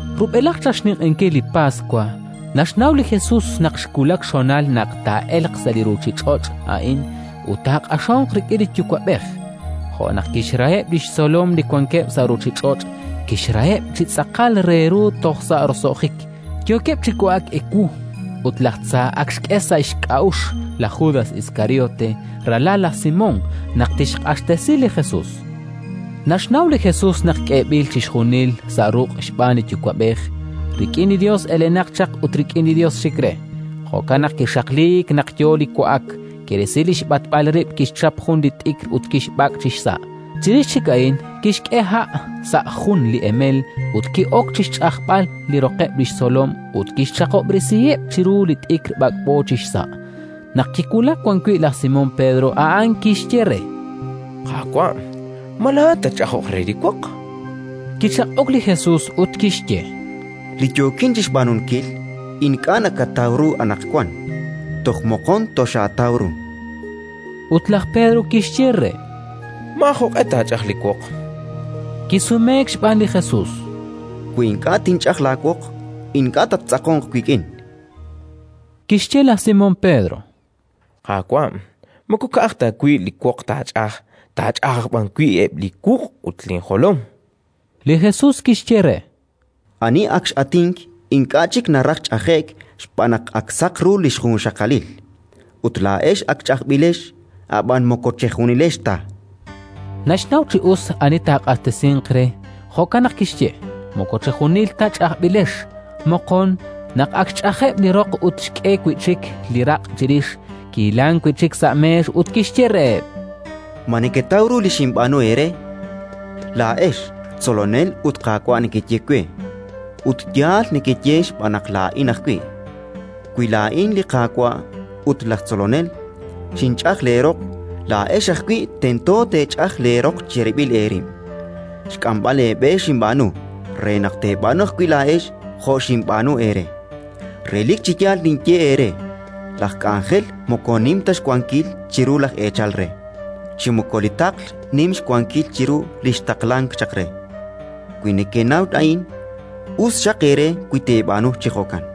Rub'elaj chaq xninq'ehinkil li Paswa naxnaw li Jesus naq xwulak xhonal naq taa'elq sa' li ruuchich'och' a'in ut taaq'axonq rik'in li Yuwa'b'ej. Jo' naq kixraheb' li xtzolom li wankeb' sa' ruuchich'och', kixraheb' chi tz'aqal re ru toj sa' roso'jik. Yookeb' chi wa'ak ewu, ut laj Tza ak xk'e sa' xk'a'uxl laj Judas Iskariote, ralal laj Simón, naq tixq'axtesi li Jesus. Naxnaw li Jesus naq k'eeb'il chixjunil sa' ruq' xb'aan li Yuwa'b'ej, rik'in li Yos elenaq chaq ut rik'in li Yos xik re. Jo'kan naq kixaqliik naq yo li wa'ak, kirisi li xb'atb'al rib', kixchap jun li t'ikr ut kixb'ak' chi xsa'. Chirix chik a'in kixk'e ha' sa' jun li emel ut ki'ok chi xch'ajb'al li roqeb' li xtzolom ut kixchaqihob'resiheb' chiru li t'ikr b'ak'b'o chi xsa'. Naq kiwulak wan wi' laj Simón Pedro, a'an kixye re: —Qaawa', ma laa'at tatch'ajoq re li woq? Kichaq'ok li Jesus ut kixye: —Li yookin chi xb'aanunkil ink'a' nakataw ru anaqwan. Toj moqon toxaataw ru. Ut laj Pedro kixye re: —Maajoq'e taach'aj li woq. Kisumeek xb'aan li Jesus: —Wi ink'a' tinch'aj laawoq, ink'a' tattz'aqonq wik'in. Kixye laj Simón Pedro: —Qaawa', moko ka'aj ta wi' li woq taach'aj, taach'aj aj b'an wi' eb' li wuq' ut linjolom. Li Jesus kixye re: —Ani ak x'atink ink'a' chik naraj ch'aje'k xb'aan naq ak saq ru li xjunxaqalil. Ut laa'ex ak ch'ajb'ilex, ab'an moko chejunilex ta. Naxnaw chi us ani taaq'axtesinq re; jo'kan naq kixye: “Moko chejunil ta ch'ajb'ilex”. Moqon, naq ak xch'ajeb' li roq ut xk'e wi' chik li raq' chirix, kihilank wi' chik sa' meex ut kixye reheb': —Ma neketaw ru li xinb'aanu eere? Laa'ex, Tzolonel ut Qaawa' nekeye we, ut yaal nekeye xb'aan naq laa'in ajwi'. Wi laa'in, li Qaawa' ut laj Tzolonel, xinch'aj leeroq, laa'ex ajwi' tento teech'aj leeroq cherib'il eerib'. Xk'amb'al eeb'e xinb'aanu, re naq teeb'aanu ajwi' laa'ex jo' xinb'aanu eere. Relik chi yaal ninye eere: laj k'anjel moko nim ta xwankil chiru laj eechal re, chi moko li taql nim xwankil chiru li xtaqlank chaq re. Wi nekenaw a'in, us xaq eere wi teeb'aanu chi jo'kan.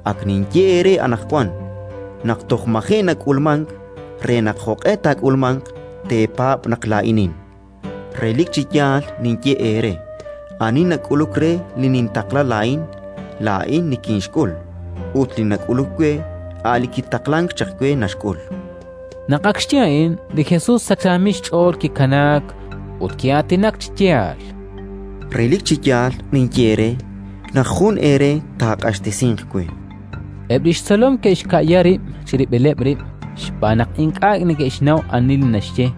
Ak ninye eere anaqwan, naq toj maji' nak'ulmank, re naq, jo'q'e taak'ulmanq, teepaab' naq Laa'inin. Relik chi yaal ninye eere: ani nak'uluk re li nintaqla laa'in, laa'in nikinxk'ul, ut li nak'uluk we, a' Li kitaqlank chaq we naxk'ul”. Naq ak xye a'in, li Jesus sachaamil xch'ool kikanaak, ut ki'aatinak chi yaal: —Relik chi yaal ninye eere naq jun eere taaq'axtesinq we, chan. Eb' li xtzolom ke'xka'ya rib' chirib'ileb' rib', xb'aan naq ink'a' neke'xnaw ani li naxye.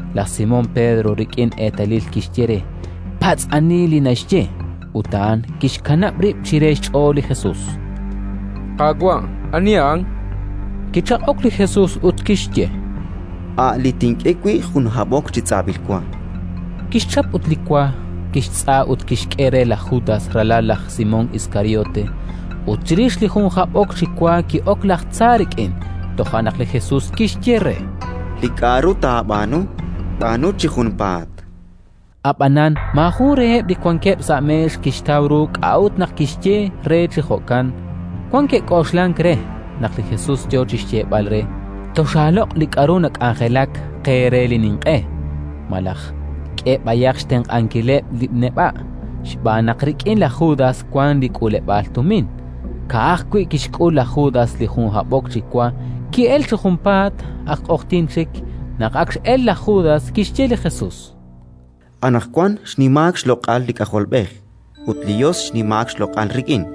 Laj Simón Pedro rik'in eetalil kixye re: “Patz' ani li naxye”. Ut a'an kix'anab' rib' chire xch'ool li Jesus: —Qaawa', ani a'an? chan re. Kichaq'ok li Jesus ut kixye: —A' li tink'e wi' jun hab'ok chi tz'ab'il wa. Kixchap ut li wa, kixtz'a ut kixk'e re laj Judas, ralal laj Simón Iskariote. Ut chirix li jun hab'ok chi wa ki'ok laj tza rik'in. Toja' naq li Jesus kixye re: —Li k'aru taab'aanu, b'aanu chi junpaat. Ab'anan maajun reheb' li wankeb' sa' meex kixtaw ru k'a'ut naq kixye re chi jo'kan. Wan ke'k'oxlank re naq li Jesus yo chi xyeeb'al re: “Toxaaloq' li k'aru nak'anjelak qe re li ninq'e”, malaj: “K'e b'ayaq xtenq'ankileb' li neb'a'”, xb'aan naq rik'in laj Judas wank li k'uuleb'aal tumin. Ka'ajwi' kixk'ul laj Judas li jun hab'ok chi wa, ki'elk chi junpaat. Ak q'oqyink chik. Naq ak x'elk laj Judas, kixye li Jesus: —Anaqwan xnimaak xloq'al li K'ajolb'ej ut li Yos xnimaak xloq'al rik'in.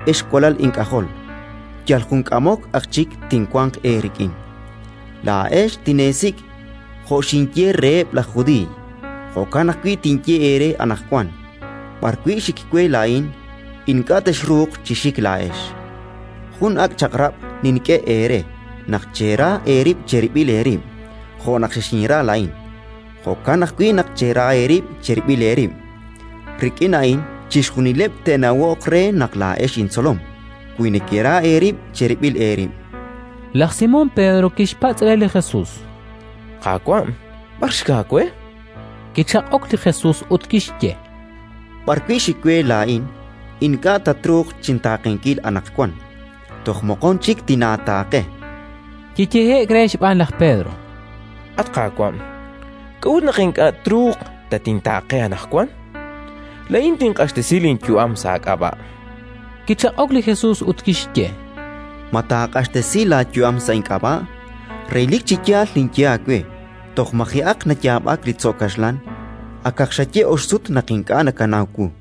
“Ex walal ink'ajol, yal jun k'amok aj chik tinwanq eerik'in. Laa'ex tineesik'. Jo' xinye reheb' laj Judiiy, jo'kan ajwi' tinye eere anaqwan: B'arwi' xik we laa'in, ink'a' texruuq chi xik laa'ex. Jun ak' chaq'rab' nink'e eere: naq chera eerib' cherib'il eerib'. Jo' naq xexinra laa'in, jo'kan ajwi' naq chera eerib' cherib'il eerib'. Rik'in a'in chixjunileb' te'nawoq re naq laa'ex intzolom: wi nekera eerib' cherib'il eerib'”. Laj Simón Pedro kixpatz' re li Jesus: —Qaawa', b'ar xik aawe? chan re. Kichaq'ok li Jesus ut kixye: —B'arwi' xik we laa'in, ink'a' tatruuq chintaaqenkil anaqwan; toj moqon chik tinaataaqe. Kiyehe'k re xb'aan laj Pedro: —At Qaawa', k'a'ut naq ink'a' truuq tatintaaqe anaqwan? Laa'in tinq'axtesi linyu'am sa' aak'ab'a'. Kichaq'ok li Jesus ut kixye: —Ma taaq'axtesi laayu'am sa' ink'ab'a'? Relik chi yaal ninye aawe: toj maji'aq nayaab'ak li tzo' kaxlan, akaq xaye ox sut naq ink'a' nakanaw wu.